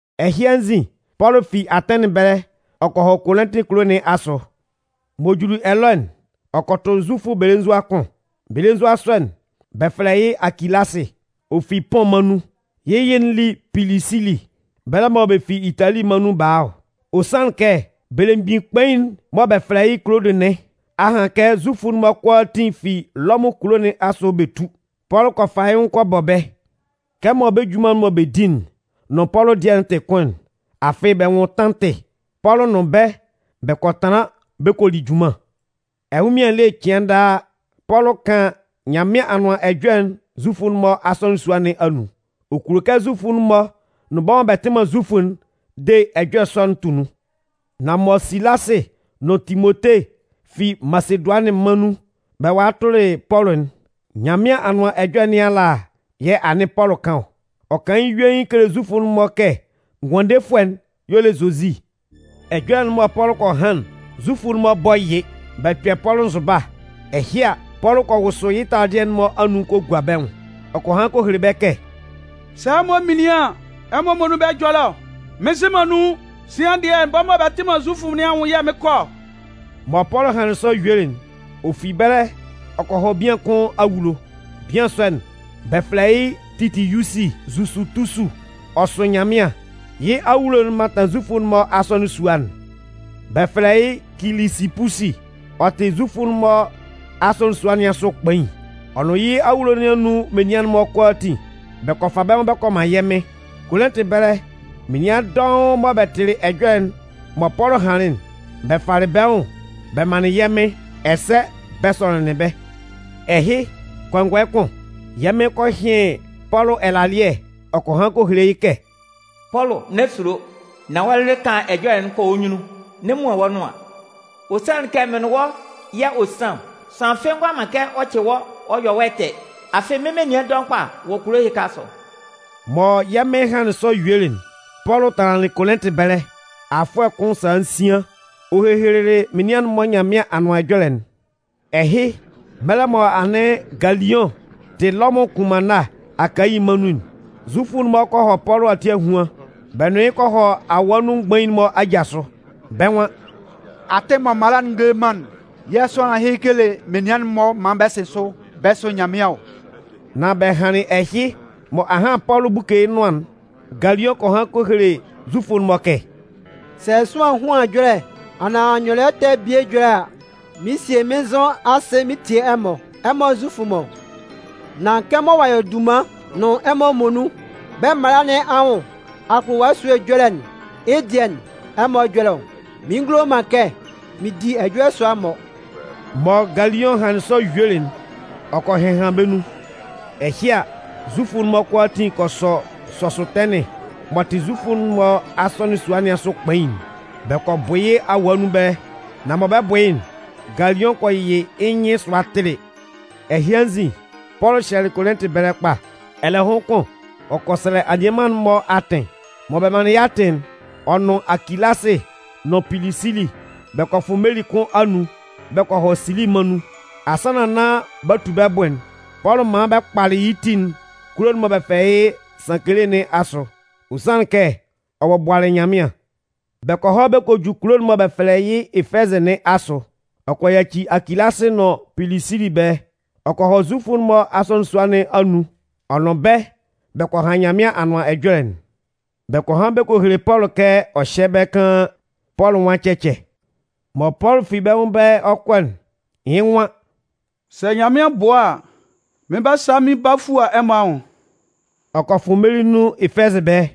Ɛhɩ anzin, Pɔlʋ fi Atɛnɩn ɛbɛlɛ ɔ kɔ hɔ Kolɩntɩ kulo nɩn asʋ. M'ɔ juli ɛlɔ'n, ɔ kɔ tʋ Zufʋ belenzua kʋn. Belenzua sɔ'n, bɛ fɛlɛ yɩ́ Akilasɩ. Ɔ fi Pʋn mân nun. Yɩ́ yɩ'n li Pilisili. Bɛlɛ mɔ bɛ fi Itali mân nun ba a ɔ. Ɔ sanlɩn kɛ belemgbin kpain'n mɔ bɛ fɛlɛ yɩ́ Kulodʋ nɩn a han kɛ Zufʋ'n-mɔ kʋalaatin fi Lɔmʋn kulo nɩn asʋ bɛ tú. Pɔlʋ kɔ fa yɩ́ nwʋn kɔ bɔ bɛ́. Kɛmɔ bɛ́ junman'n mɔ bɛ di'n nʋn Pɔlʋ dɩɛ'n tɩ kʋn'n, afɩ bɛ nwʋn tantɩ, Pɔlʋ nʋn bɛ́ bɛ kɔ tanlan bɛ kɔ li junman. Ɛnwʋnmɩan ele cɩan daa, Pɔlʋ kan Nyanmɩan Anʋan Ɛjɔlɛ'n Zufʋ'n-mɔ asɔnɩn sua nɩn anun. Ɔ kulo kɛ Zufʋ'n-mɔ nʋn bɛ́ mɔ bɛ tɩ man Zufʋ'n de ɛjɔlɛ sɔ'n tʋ nun. Nan mɔ Silasɩ nʋn Timote fi Masedʋanɩn mân nun bɛ walɩ tʋlɩ Pɔlʋ'n, Nyanmɩan Anʋan Ɛjɔlɛ nɩn ala yɛ̂ anɩn Pɔlʋ kan ɔ. Ɔ kan yɩ́ yuein kele Zufʋ'n-mɔ kɛ Ngʋandefʋɛ'n y'ɔ le Zozi. Ɛjɔlɛ'n mɔ Pɔlʋ kɔ han'n, Zufʋ'n-mɔ bɔ yɩ. Bɛ kpɛ Pɔlʋ nzʋba. Ɛhɩ a, Pɔlʋ kɔ wʋsʋ yɩ́ taladɩɛ'n-mɔ anun kɔ gua bɛ́ nwʋn, ɔ kɔ han kɔ hele bɛ́ kɛ: “Sɛ ɛmɔ minlin an, ɛmɔ muonun bɛ́ ɛjɔlɛ ɔ. Mɩn nzɩ man nun. Sian dɩɛ, bɛ́ mɔ bɛ tɩ man Zufʋ nɩn anwʋn yɛ̂ mɩɩn kɔ ɔ.” Mɔ Pɔlʋ hanlɩn sɔ yuelɩ'n, ɔ fi ɛbɛlɛ ɔ kɔ hɔ bian kʋn awulo. Bian sɔ'n, bɛ fɛlɛ yɩ́ Titiyusi Zusutusu. Ɔ sʋ Nyanmɩan. Yɩ́ awulo'n mantan Zufʋ'n-mɔ asɔnɩn sua'n. Nunhan kʋn, bɛ fɛlɛ yɩ́ Kilisipusi, ɔ tɩ Zufʋ'n-mɔ asɔnɩn sua nɩn asʋ kpain. Ɔ nʋn yɩ́ awulo nɩn anun menian'n-mɔ kʋalaatin bɛ kɔ fa bɛ́ nwʋn bɛ kɔ man yɛ́ Mɩn. Kolɩntɩ ɛbɛlɛ menian dɔʋn mɔ bɛ tɩlɩ ɛjɔlɛ'n mɔ Pɔlʋ hanlɩn'n, bɛ falɩ bɛ́ nwʋn bɛ manlɩn yɛ́ Mɩn ɛsɛ bɛ sɔnɩnlɩn bɛ́. Ɛhɩ, kɔngɔɛ kʋn, yɛ́ Mɩn kɔ hɩn Pɔlʋ ɛlalɩɛ ɔ kɔ han kɔ hele yɩ́ kɛ: “Pɔlʋ, n'ɛ sulo, nan wɔ́ lɩlɩ kan ɛjɔlɛ'n kɔ wɔ́ nyunnun, n'ɛ muan wɔ́ nʋan. Ɔ sanlɩn kɛ mɩn nʋn wɔ́ yɛ̂ ɔ san ɔ. Sʋanlan fɩ́ɩ́ ngʋala man kɛ ɔ cɩ wɔ́ ɔ yɔ wɔ́ ɛtɛ. Afɩ mɩ́n menian dɔʋn kpa wɔ kulo ɛhɩka asʋ.” Mɔ yɛ́ Mɩn hanlɩn sɔ yuelɩ'n, Pɔlʋ tanlanlɩn Kolɩntɩ ɛbɛlɛ afʋɛ kʋn sala nsian ɔ hehelelɩ menian'n-mɔ Nyanmɩan Anʋan Ɛjɔlɛ'n. Ɛhɩ, mɛlɛ mɔ anɩn Galiʋn tɩ Lɔmʋn kʋnmanna Akayi mân nun'n, Zufʋ'n-mɔ kɔ hɔ Pɔlʋ ati ahuan. Bɛ nʋn yɩ́ kɔ hɔ awaa nun mgbain'n-mɔ aja sʋ. Bɛ́ nwan: “Atɩn mɔ mala'n ngele man'n yɛ̂ sʋanlan ɛhɩ kele menian'n-mɔ maan bɛ sɩn sʋ bɛ sʋ Nyanmɩan ɔ.” Nan bɛ hanlɩn ɛhɩ mɔ ahan Pɔlʋ 'buke yɩ́ nʋan'n, Galiʋn kɔ han kɔ hele Zufʋ'n-mɔ kɛ: “Sɛ sʋanlan ehuan ɛjɔlɛ anaan nyɔlɩɛ ɛtɛ bie ɛjɔlɛ a, mɩn 'sie mɩ́n nzʋ mɩn tie ɛmɔ, ɛmɔ Zufʋ'n-mɔ. Nan kɛmɔ ɔ'a yɔ dunman nʋn ɛmɔ muonun bɛ́ mala nɩn anwʋn akpʋlʋwa esúe ɛjɔlɛ'n, yɩ́ dɩɛ ɛmɔ ɛjɔlɛ ɔ. Mɩn ngulo man kɛ mɩn di ɛjɔlɛ sʋa-mɔ!” Mɔ Galiʋn hanlɩn sɔ yuelɩ'n, ɔ kɔ hɩhan bɛ́ nun. Ɛhɩ a, Zufʋ'n-mɔ kʋalaatin kɔ sɔ Sɔsʋtɛnɩn m'ɔ tɩ Zufʋ'n-mɔ asɔnɩn sua nɩn asʋ kpain'n, bɛ kɔ bʋ yɩ́ awaa nun ɛbɛlɛ. Nan mɔ bɛ 'bʋ yɩ́'n, Galiʋn kɔ yɩ yɩ́ nyɩn sʋa tili. Ɛhɩ anzin, Pɔlʋ hyɛlɩ Kolɩntɩ ɛbɛlɛ kpa. Ɛlɛhʋn kʋn, ɔ kɔ sɛlɛ anianman'n-mɔ atɩn. Mɔ bɛ manlɩn yɩ́ atɩn'n, ɔ nʋn Akilasɩ nʋn Pilisili bɛ kɔ fʋ meli kʋn anun bɛ kɔ hɔ Sili mân nun. Asannan nán b'a tu bɛ́ bʋ'n, Pɔlʋ man bɛ kpalɩ yɩ́ ti'n kulo'n mɔ bɛ fɛlɛ yɩ́ Sankele nɩn asʋ. Ɔ sanlɩn kɛ, ɔ bɔbʋalɩ Nyanmɩan. Bɛ kɔ hɔ kɔ ju kulo'n mɔ bɛ fɛlɛ yɩ́ Efɛzɩ nɩn asʋ. Ɔ kɔ yaci Akilasɩ nʋn Pilisili ɛbɛlɛ. Ɔ kɔ hɔ Zufʋ'n-mɔ asɔnɩn sua nɩn anun ɔ nʋn bɛ́ bɛ kɔ han Nyanmɩan Anʋan Ɛjɔlɛ'n. Bɛ kɔ han bɛ kɔ hele Pɔlʋ kɛ ɔ hyɛ́ ɛbɛlɛ kaan. Pɔlʋ nwan cɛcɛ. Mɔ Pɔlʋ fi bɛ́ nwʋn ɛbɛlɛ ɔ 'kɔ'n, yɩ́ nwan: “Sɛ Nyanmɩan bʋa a, mɩn 'ba sa mɩn ba fua ɛmɔ anwʋn.” Ɔ kɔ fʋ meli nun Efɛzɩ ɛbɛlɛ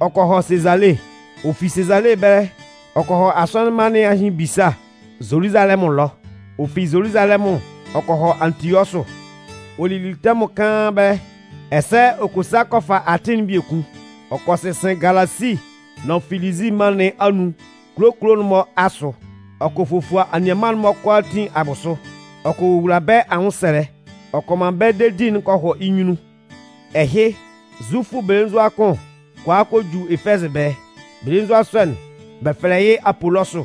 ɔ kɔ hɔ Sezale. Ɔ fi Sezale ɛbɛlɛ ɔ kɔ hɔ asɔnɩn mma nɩn ahɩn ebisa Zoluzalɛmʋn ɛlɔ. Ɔ fi Zoluzalɛmʋn ɔ kɔ hɔ Antiɔsʋ. Ɔ lili tɛmʋn kaan ɛbɛlɛ. Ɛsɛ ɔ kɔ sa kɔ fa atɩn'n biekun. Ɔ kɔ sɩnsɩn Galasi nʋn Filizi mân nɩn anun kulo kulo'n-mɔ asʋ, ɔ kɔ fofua anianman'n-mɔ kʋalaatin abʋsʋ, ɔ kɔ wowula bɛ́ anwʋnsɛlɛ, ɔ kɔ man bɛ́ dedi'n kɔ hɔ yɩ́ nyunnun. Ɛhɩ, Zufʋ belenzua kʋn kɔ a kɔ ju Efɛzɩ ɛbɛlɛ. Belenzua sɔ'n bɛ fɛlɛ yɩ́ Apolɔsʋ.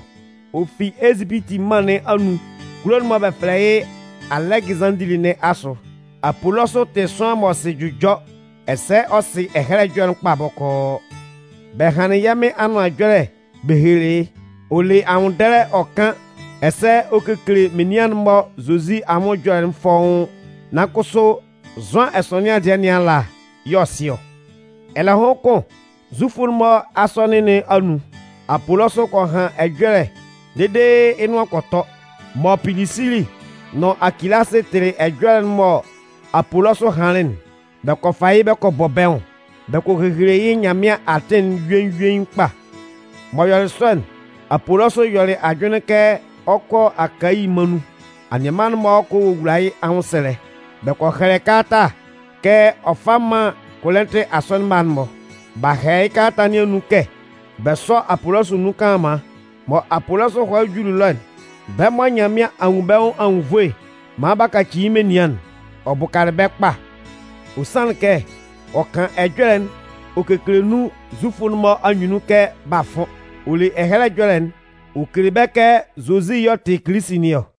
Ɔ fi Ezipiti mân nɩn anun kulo'n mɔ bɛ fɛlɛ yɩ́ Alɛgɩzanndili nɩn asʋ. Apolɔsʋ tɩ sʋanlan m'ɔ sɩ jʋjɔ ɛsɛ ɔ sɩ Ɛhɛlɛ Ɛjɔlɛ'n kpa bɔkɔɔ. Bɛ hanlɩn yɛ́ Mɩn Anʋan Ɛjɔlɛ bɛ helelɩ yɩ́. Ɔ le anwʋnndɛlɛ ɔ kan ɛsɛ ɔ kekele menian'n-mɔ Zozi anwʋn ɛjɔlɛ'n fɔ́ʋ́n. Nan kʋsʋ, Zʋan ɛsɔnɩan dɩɛ nɩn ala y'ɔ sɩ yɩ́ ɔ. Ɛlɛhʋn kʋn, Zufʋ'n-mɔ asɔnɩn nɩn anun, Apolɔsʋ kɔ han ɛjɔlɛ dede yɩ́ nʋan kɔ tɔ. Mɔ Pilisili nʋn Akilasɩ tɩlɩ ɛjɔlɛ'n mɔ Apolɔsʋ hanlɩn'n, bɛ kɔ fa yɩ́ bɛ kɔ bɔ bɛ́ nwʋn. Bɛ kɔ hehele yɩ́ Nyanmɩan atɩn'n yuein yuein kpa. M'ɔ yɔlɩ sɔ'n, Apolɔsʋ yɔlɩ ajʋnlɩn kɛ ɔ 'kɔ Akayi mân nun. Anianman'n-mɔ kɔ wowula yɩ́ anwʋnsɛlɛ. Bɛ kɔ hɛlɛ kalata kɛ ɔ fá mán Kolɩntɩ asɔnɩn mma'n-mɔ. B'a hɛlɛ yɩ́ kalata nɩn anun kɛ bɛ sɔ́ Apolɔsʋ nun kanlanman. Mɔ Apolɔsʋ hɔlɩ juli ɛlɔ'n, bɛ́ mɔ Nyanmɩan a nwun bɛ́ nwʋn anwunnvoe maan b'a kaci yɩ́ menian'n, ɔ bʋkalɩ bɛ́ kpa. Ɔ sanlɩn kɛ ɔ kan ɛjɔlɛ'n ɔ kekele nun Zufʋ'n-mɔ anyunnun kɛ b'a fʋn. Ɔ le Ɛhɛlɛ Ɛjɔlɛ'n ɔ kele bɛ́ kɛ Zozi y'ɔ tɩ Kilisi nɩn ɔ.